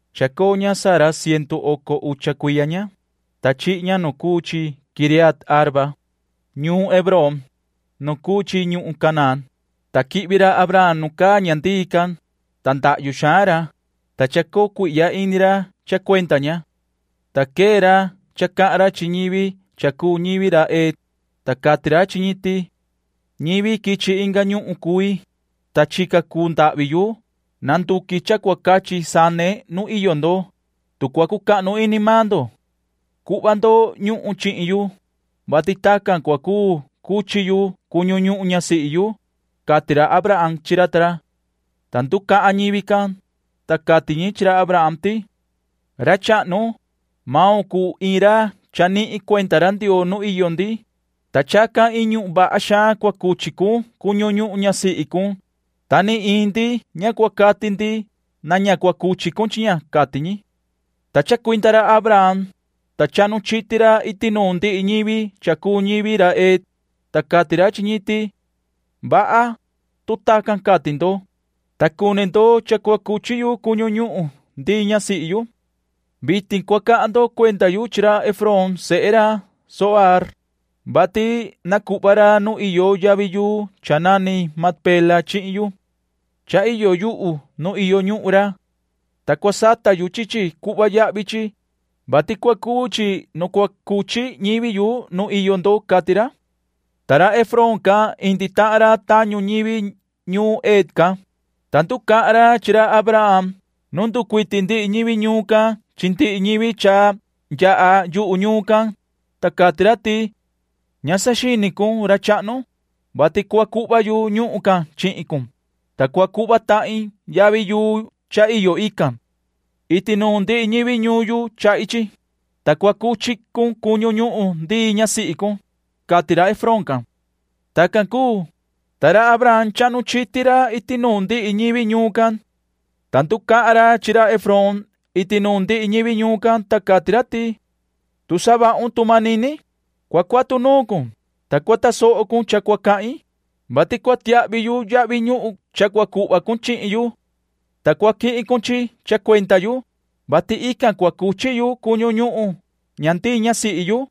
Chacoo ña Sara cientu oco ucha cuiya ña, ta chihi ña nu cuu chi Quiriat-arba, ñuun Hebrón, nu cuu chi ñuhun Canaán, ta quihvi ra Abraham nu caa ña ndii can, ta ndahyu xaan ra, ta chacoo cuihya ini ra cha cuenda ña. Ta quee ra cha cahan ra chi ñivi cha cuu ñivi ra Het, ta cati ra chi ñi ti: ―Ñivi quichi inga ñuhun cui, ta chica cuu ndahvi yu nanduqui cha cua cachi sane nu iyo ndo. Tu cua cucahnu ini maan ndo, cuhva ndo ñuhun chihin yu, vati tacan cua cuu cuchi yu cuñu ñuhun ñasihi yu ―cati ra Abraham chi ra ta ra. Ta nducahan ñivi can, ta cati ñi chi ra Abraham ti: ―Ra chahnu, maun cuu iin ra chanihin cuenda ra Ndioo nu iyo ndi, ta chacan iin ñuhun vaha xaan cua cuchi cun cuñu ñuhun ñasihi cun, ta ni iin ndi ña cua cati ti na ña cuchi cun chi ña ―cati ñi. Ta chacuinda ra Abraham, ta chahnu chiti ra iti nuun ndihi ñivi cha cuu ñivi ra Het, ta cati ra chi ñi ti: ―Vaha, tu tacan cati ndo, ta cuni ndo cha cua cuchi yu cuñu ñuhun ndii ñasihi yu. Vitin cua cahan ndo cuenda yu chi ra Efrón sehe ra Zohaar, vati na cuhva ra nu iyo yavi yuu cha nani Macpela chihin yu. Cha iyo yuhu nu iyo ñuhun ra. Ta cua sata yu chi chi cuhva yahvi chi, vati cua cuu chi nu cua cuchi ñivi yu nu iyo ndo ―cati ra. Ta ra Efrón can indi tahan ra tañu ñivi ñuun Het can, ta nducahan ra chi ra Abraham nu nducuiti ndihi ñivi ñuun can chi ndihi ñivi cha yaha yuhu ñuun can, ta cati ra ti: ―Ña saxini cun, ra chahnu, vati cua cuhva yu ñuhun can chihin cun, ta cua cuhva tahin yavi yuu cha iyo ican. Iti nuun ndihi ñivi ñuun yu chahi chi, ta cua cuchi cun cuñu ñuhun ndii ñasihi cun ―cati ra Efrón can. Tacan cuu, ta ra Abraham chahnu chiti ra iti nuun ndihi ñivi ñuun can. Ta nducahan ra chi ra Efrón iti nuun ndihi ñivi ñuun can, ta cati ra ti: ―Tu savahun tu manini, cua cuatu nuun cun, ta cua tasoho cun cha cua cahin, vati cua tiahvi yu yahvi ñuhun cha cua cuhva cun chihin yu, ta cua quihin cun chi cha cuenda yu, vati ican cua cuchi yu cuñu ñuhun ña ndii ñasihi yu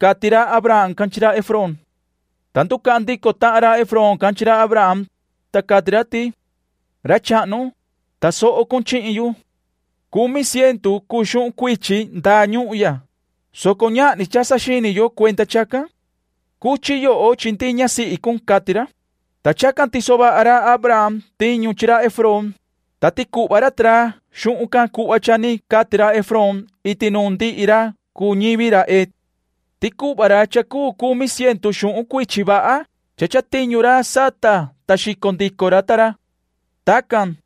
―cati ra Abraham chi ra Efrón. Ta nducahan ndico tahan ra Efrón can chi ra Abraham, ta cati ra ti: ―Ra chahnu, tasoho cun chihin yu. Cumi cientu cuu xuhun cuichi ndaa ñuhun ya, soco ñahni cha saxini yo cuenda chacan. Cuchi yoho chi ndii ñasihi cun ―cati ra. Ta chacan tiso vaha ra Abraham tiñu chi ra Efrón, ta ticuhva ra ta ra xuhun can cuhva cha ni cati ra Efrón iti nuun ndihi ra cuu ñivi ra Het. Ticuhva ra cha cuu cumi cientu xuhun cuichi vaha cha chatiñu ra sata ta xico ra ta ra. Tacan,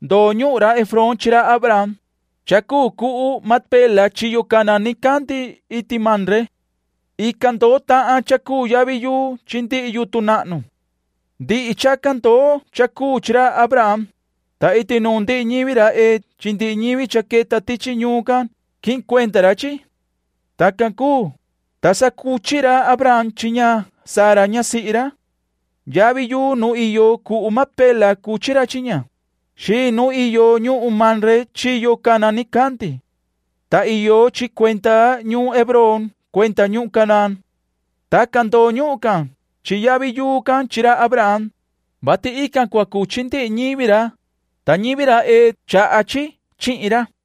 ndoo ñuhun ra Efrón chi ra Abraham, cha cuu cuhu Macpela chiyo cana nicandi iti Mamre. Ican ndoo tahan cha cuu yavi yuu chi ndihi yutun nahnu. Ndihi chacan ndoo cha cuu chi ra Abraham, ta iti nuun ndihi ñivi ra Het chi ndihi ñivi cha queta tichi ñuun can quihin cuenda ra chi. Tacan cuu, ta sa cuchi ra Abraham chi ña Sara ñasihi ra. Yavi yuu nu iyo cuhu Macpela cuchi ra chi ña, xiin nu iyo ñuhun Mamre chiyo cana nicandi. Ta iyo chi cuenda ñuun Hebrón cuenda ñuhun Canaán. Tacan ndoo ñuhun can chi yavi yuu can chi ra Abraham, vati ican cua cuchi ndihi ñivi ra, ta ñivi ra Het chaha chi chihin ra.